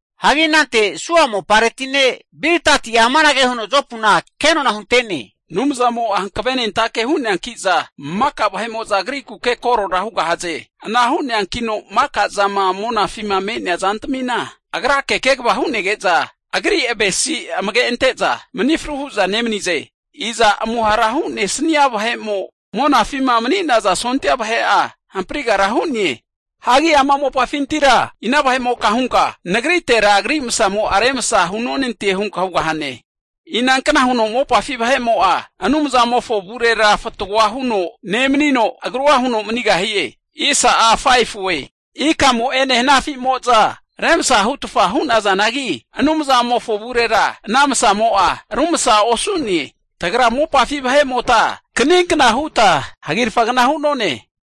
Hagi anante Suha mopareti ne' Bildati'a amanage huno Jopuna kenona hunte'ne, Anumzamo'a hankavenentake hu'neanki'za maka vahe'mo'za Agrikuke korora hugahaze. Ana hu'neankino maka zama monafima me'nea zantamina Agrake kegava hu'nege'za Agri avesi amage ante'za, mani fru hu'za nemanize. Iza amuhara hu'nesnia vahe'mo monafima mani'naza sondia vahe'a hamparigara hu'ne? Hagi ama mopafintira ina vahe'moka hunka nagritera Agri masamo'a remsa hunonante hunka hugahane? Inankna huno mopafi vahe'mo'a Anumzamofo avurera fatgoa huno nemanino, agrua huno manigahie? Ikamo'ene hanafimo'za remsa hutfa hu'nazanagi, Anumzamofo avurera ana masamo'a rumsa osu'ne. Tagra mopafi vahe'mota kaninkna huta hagirafagna hu'none.